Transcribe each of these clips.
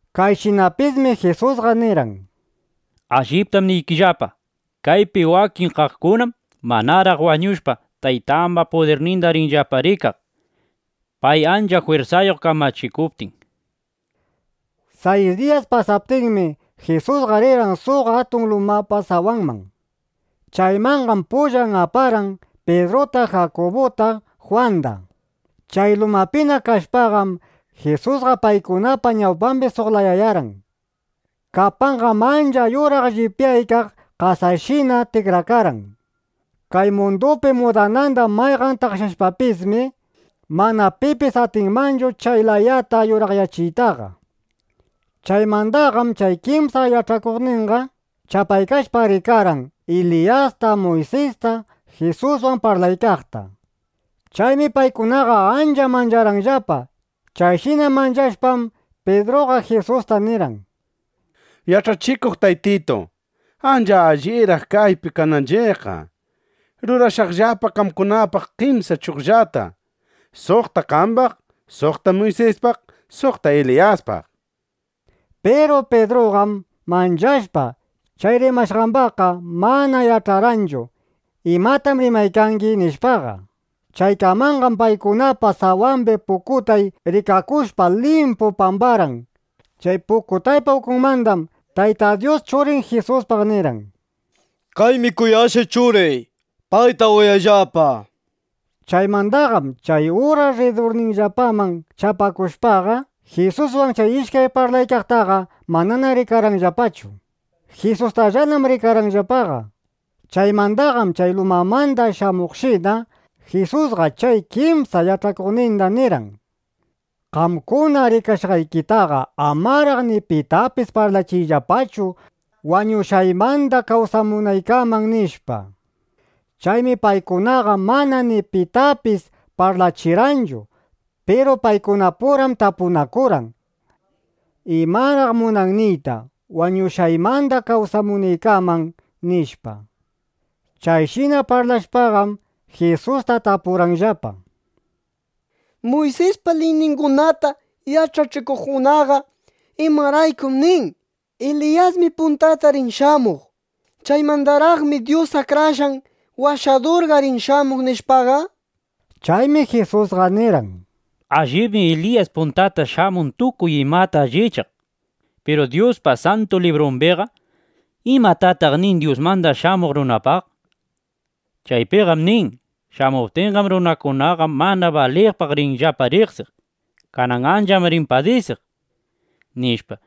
Kayshinapismi Jisusqa nirqan: —Alliptam niykillapa, kaypi wakin kaqkunam manaraq wañushpa, Taytaypa pudirninda rinllapa rikaq, pay ancha jwirsayuq kamachikuptin, nishpa. Sayis diyas pasaptinmi, Jisusqa rirqan suq atun lumapa sawanman. Chaymanqam pullan aparqan Pidruta, Jakubuta, Jwanda. Chay lumapina kashpaqam, Jisusqa paykunapa ñawpambi suq layayarqan. Kapanqam ancha yuraq llipyaykaq ˻qasashina˼ tikrakarqan. Kay mundupi mudananda mayqan taqshashpapismi, mana pipis atinmanchu chay layata yuraqyachiytaqa. Chaymandaqam chay kimsa yach'akuqninqam chapaykashpa rikarqan Eliyasta, Muysista Jisuswan parlaykaqta. Chaymi paykunaqa ancha mancharqanllapa. Chayshina manchashpam, Pidruqa Jisusta nirqan: —Yach'achikuq Taytitu. Ancha alliraq kaypi kananchiqqa. Rurashaqllapa qamkunapaq kimsa chugllata: suqta qambaq, suqta Muysispaq, suqta Eliyaspaq, nishpa. Piru Pidruqam manchashpa, chay rimashqambaqqa mana yach'arqanchu: ¿Imatam rimaykani? nishpaqa. Chaykamanqam paykunapa sawambi pukutay rikakushpa, limpu pambarqan. Chay pukutaypa ukunmandam Tayta Dyus Churin Jisuspaq nirqan: —Kaymi kuyashqay Churiy. Payta uyayllapa, nishpa. Chaymandaqam chay uras rridurninllapaman chapakushpaqa, Jisuswan chay ishkay parlaykaqtaqa manana rikarqanllapachu. Jisustallanam rikarqanllapaqa. Chaymandaqam chay lumamanda shamuqshina, Jisusqa chay kimsa yach'akuqninda nirqan: —Qamkuna rikashqaykitaqa amaraq ni pitapis parlachiyllapachu wañushqaymanda kawsamunaykaman, nishpa. Chaymi paykunaqa mana ni pitapis parlachirqanchu. Piru paykunapuram tapunakurqan: —¿Imaraq munan niyta: “Wañushqaymanda kawsamunaykaman”, nishpa? Chayshina parlashpaqam, Jisusta tapurqanllapa: —Muysispa liyningunata yach'achikuqkunaqa ¿imaraykum nin: “Eliyasmi puntata rin shamuq. (Chaymandaraqmi Dyus Akrashqan Washadurqa rin shamuq”, nishpaqa?) Chaymi Jisusqa nirqan: —Allibmi Eliyas puntata shamun tukuy imata allichaq. Piru Dyuspa Santu Librumbiqa ¿imatataq nin Dyusmanda Shamuq Runapaq? Chaypiqam nin: “Shamuptinqam, runakunaqa mana baliqpaq rinllapa riqsiq. Kanan ancham rin padisiq”, nishpa.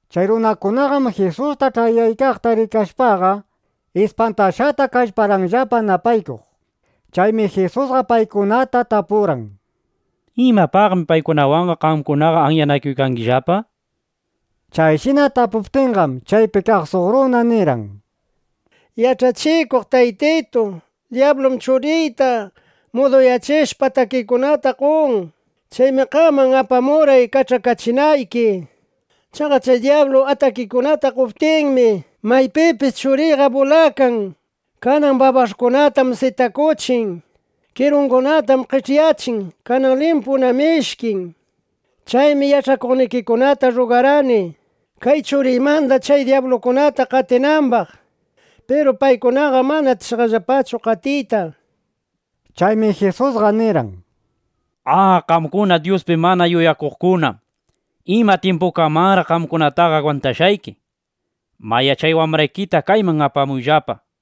Chay runakunaqam Jisusta ch'ayaykaqta rikashpaqa, ispantashqata kallparqanllapa napaykuq. Chaymi Jisusqa paykunata tapurqan: —¿Imapaqmi paykunawanqa qamkunaqa anyanakuykangillapa? nishpa. Chayshina tapuptinqam, chaypi kaq suq runa nirqan: —Yach'achikuq taytitu, dyablum churiyta muduyachishpa, atakikunata qon. Chaymi qaman apamurqay kach'akachinayki. Chaqa chay dyablu chay atakikunata qoptinmi, maypipis churiyqa bulakan. Kanan babash'kunatam sitakuchin. ¡Kirungunatam qech'yachin! Kanan limpunam ishkin. Chaymi yach'akuqnikikunata rrugarqani, kay churiymanda chay dyabluta qatinambaq. Piru paykunaqam mana atishqallapachu qatiyta, nishpa. Chaymi Jisusqa nirqan: —¡A, qamkuna Dyuspi mana yuyakuqkuna! ¿Ima tyimpukamanraq qamkunataqa agwantashqayki? Mayá, chay wambraykita kayman apamuyllapa, nishpa.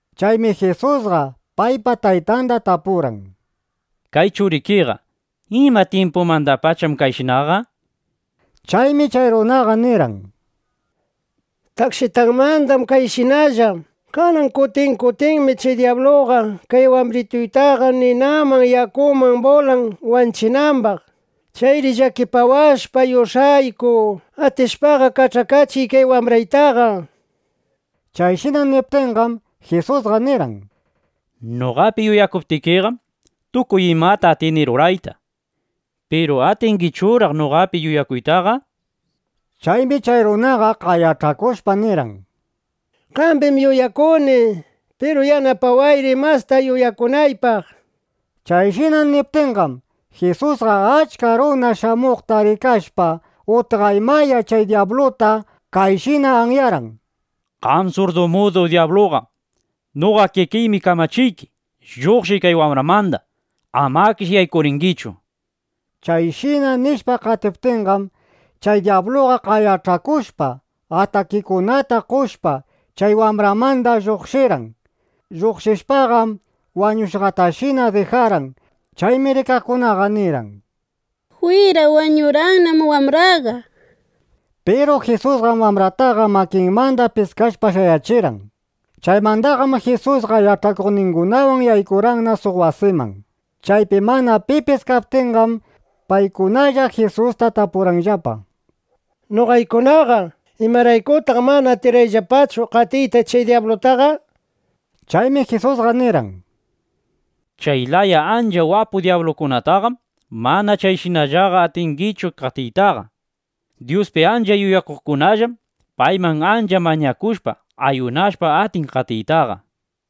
Chaymi Jisusqa paypa taytanda tapurqan: —Kay churikiqa, ¿ima tyimpumandapacham kayshinaqa? nishpa. Chaymi chay runaqa nirqan: —Takshitanmandam kayshinalla. Kanan kutin kutinmi chay dyabluqa kay wambrituytaqa ninaman yakuman bulan wanchinambaq. ¡Chayri llakipawashpa yush'ayku, atishpaqa kach'akachiy kay wambraytaqa! nishpa. Chayshina niptinqam, Jisusqa nirqan: —Noqapi yuyakuptikiqam, tukuy imata atini rurayta. Piru ¿atingichuraq noqapi yuyakuytaqa? nishpa. Chaymi chay runaqa qayach'akushpa nirqan: —¡Qambim yuyakuni! ¡Piru yanapawayri, masta yuyakunaypaq! nishpa. Chayshina niptinqam, Jisusqa achka runa shamuqta rikashpa, utqaymaya chay dyabluta kayshina anyarqan: —¡Qam surdu mudu dyabluqa, noqa kikiymi kamachiyki, lluqshiy kay wambramanda! ¡Amakish yaykuringichu! nishpa. Chayshina nishpa qatiptinqam, chay dyabluqa qayach'akushpa, atakikunata qoshpa, chay wambramanda lluqshirqan. Lluqshishpaqam wañushqatashina dijarqan. Chaymi rikaqkunaqa nirqan: —¡Jwira, wañurqannam wambraqa! nishpa. Piru Jisusqam wambrataqa makinmanda piskashpa shayachirqan. Chaymandaqam Jisusqa yach'akuqningunawan yaykurqanna suq wasiman. Chaypi mana pipis kaptinqam, paykunalla Jisusta tapurqanllapa: —Noqaykunaqa, ¿imaraykutaq mana atirqayllapachu qatiyta chay dyablutaqa? nishpa. Chaymi Jisusqa nirqan: —Chay laya ancha wapu dyablukunataqam mana chayshinallaqa atinchiqchu qatiytaqa. Dyuspi ancha yuyakuqkunallam payman ancha mañakushpa, ˻ayunashpa˼ atin qatiytaqa.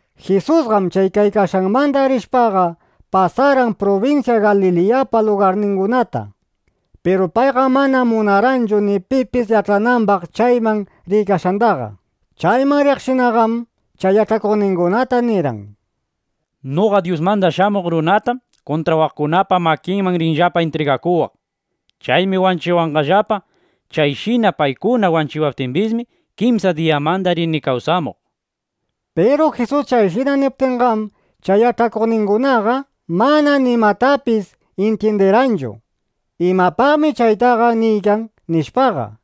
Jisusqam chay kaykashqanmanda rishpaqa, pasarqan prubinsya Galiliyapa lugarningunata. Piru payqam mana munarqanchu ni pipis yach'anambaq chayman riykashqandaqa. Chayman riqshinaqam chay yach'akuqningunata nirqan: —Noqa Dyusmanda Shamuq Runatam kuntrawaqkunapa makinman rinllapa intrigakuwaq. Chaymi wanchiwanqallapa. Chayshina paykuna wanchiwaptimbismi, kimsa diyamanda rini kawsamuq, nishpa. Piru Jisus chayshina niptinqam, chay yach'akuqningunaqa mana nimatapis intyindirqanchu: ¿Imapaqmi chaytaqa niykan? nishpaqa.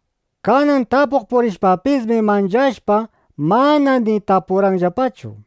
Kanan tapuq purishpapismi, manchashpa, mana ni tapurqanllapachu.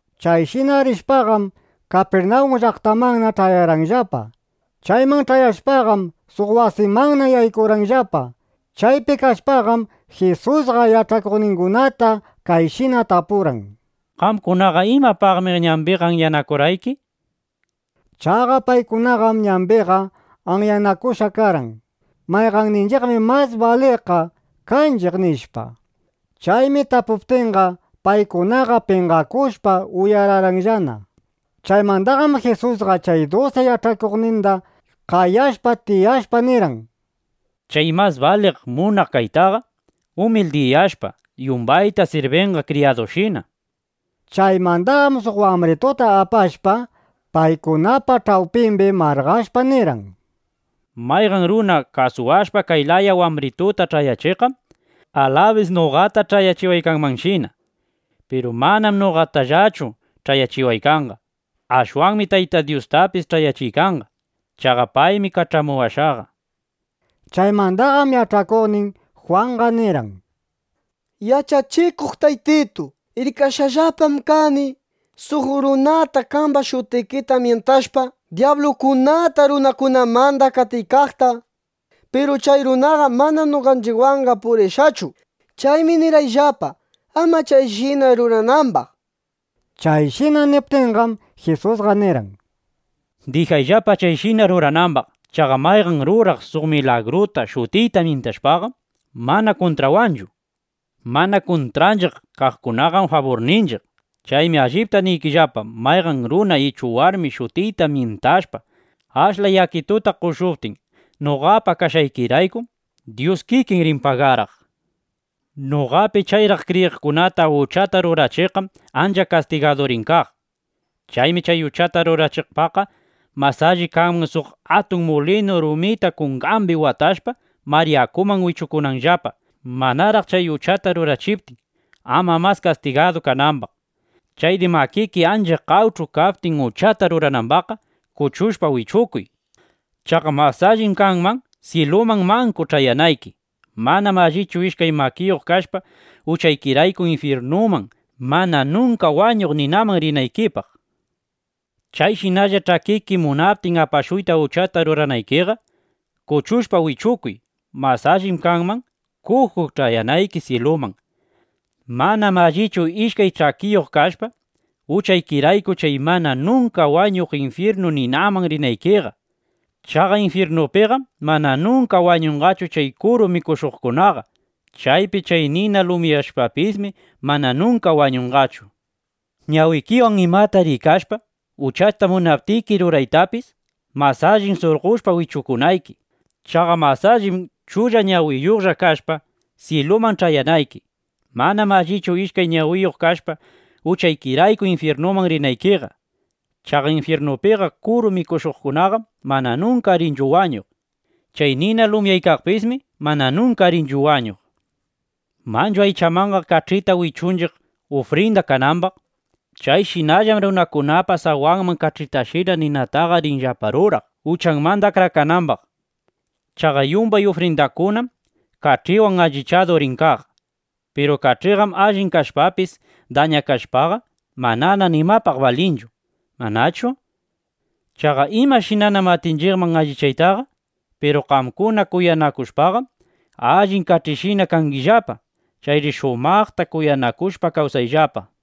Chayshina rishpaqam, Kapirnawun llaqtamanna ch'ayarqanllapa. Chayman ch'ayashpaqam, suq wasimanna yaykurqanllapa. Chaypi kashpaqam, Jisusqa yach'akuqningunata kayshina tapurqan: —¿Qamkunaqa imapaqmi ñambiqa anyanakurqayki? nishpa. Chaqa paykunaqam ñambiqa anyanakushqaqa karqan: “Mayqanninchiqmi mas baliqqa kanchiq”, nishpa. Chaymi tapuptinqa, paykunaqa penqakushpa, uyararqanllana. Chaymandaqam Jisusqa chay dusi yach'akuqninda qayashpa, tiyashpa, nirqan: —Chay mas baliq munaq kaytaqa, umildiyashpa, yumbayta sirbinqa kriyadushina, nishpa. Chaymandaqam suq wambrituta apashpa, paykunapa ch'awpimbi marqashpa nirqan: —Mayqan runa kasuwashpa kay laya wambrituta ch'ayachiqqam, alabis noqata ch'ayachiwaykanmanshina. Piru manam noqatallachu ch'ayachiwaykanqa. Ashwanmi Taytay Dyustapis ch'ayachiykanqa. Chaqa paymi kach'amuwashqa, nishpa. Chaymandaqam yach'akuqnin Jwanqa nirqan: —Yach'achikuq Taytitu, rikashqallapam kani suq runata qamba shutikita myintashpa, dyablukunata runakunamanda qatiykaqta. Piru chay runaqam mana noqanchiqwanqa purishqachu. Chaymi nirqayllapa, ama chayshina ruranambaq, nishpa. Chayshina niptinqam, Jisusqa nirqan: —Dijayllapa chayshina ruranambaq. Chaqa mayqan ruraq suq milagruta shutiyta myintashpaqam, mana kuntrawanchu. Mana kuntranchiq kaqkunaqam, faburninchiq. Chaymi allipta niykillapa, mayqan runa ichu warmi shutiyta myintashpa, ashla yakituta qoshuptin noqapa kashqaykiraykum, Dyus kikin rin pagaraq, nishpa. ’Noqapi chayraq kriyiqkunata uchata rurachiqqam ancha kastigadu rin kaq. Chaymi chay uchata rurachiqpaqqa mas alli kanman suq atun mulinu rumita kungambi watashpa, mar yakuman wichukunanllapa (manaraq chay uchata rurachiptin, ama mas kastigadu kanambaq). Chayri makiki ancha qawch'u kaptin uchata ruranambaqqa, kuchushpa wichukuy. Chaqa mas allim kanman, syiluman manku ch'ayanayki. Manam allichu ishkay makiyuq kashpa, uchaykirayku infyirnu mana nunka wañuq ninaman rinaykipaq. Chayshinalla ch'akiki munaptin apashuyta uchata ruranaykiqa, kuchushpa wichukuy. Mas allim kanman, kuju ch'ayanayki syiluman. Manam allichu ishkay ch'akiyuq kashpa, uchaykirayku chay mana nunka wañuq infyirnu ninaman rinaykiqa. ˻Chaqa infyirnupiqam mana nunka wañunqachu chay kuru mikushuqkunaqa. Chaypi chay nina lumyaqpismi mana nunka wañunqachu.˼ Ñawikiwan imata rikashpa, uchata munaptiki ruraytapis, mas allim surqoshpa wichukunayki. Chaqa mas allim chulla ñawiyuqlla kashpa, syiluman ch'ayanayki. Manam allichu ishkay ñawiyuq kashpa, uchaykirayku infyirnuman rinaykiqa. Chaqa infyirnupiqa kuru mikushuqkunaqam mana nunka rinchu wañuq. Chay nina lumyaykaqpismi mana nunka rinchu wañuq. ’(Manchu aychamanqa kach'ita wichunchiq, ufrinda kanambaq.) Chayshinallam runakunapa sawanman kach'itashina ninataqa rinllapa ruraq, (uchanmanda akrakanambaq). Chaqa yumbay ufrindakunam kach'iwan allichadu rin kaq. Piru kach'iqam allin kashpapis dañakashpaqa, manana nimapaq balinchu, ¿manachu? Chaqa ¿imashinanam atinchiqman allichaytaqa? Piru qamkuna kuyanakushpaqam, allin kach'ishina kangillapa. Chayri shumaqta kuyanakushpa kawsayllapa.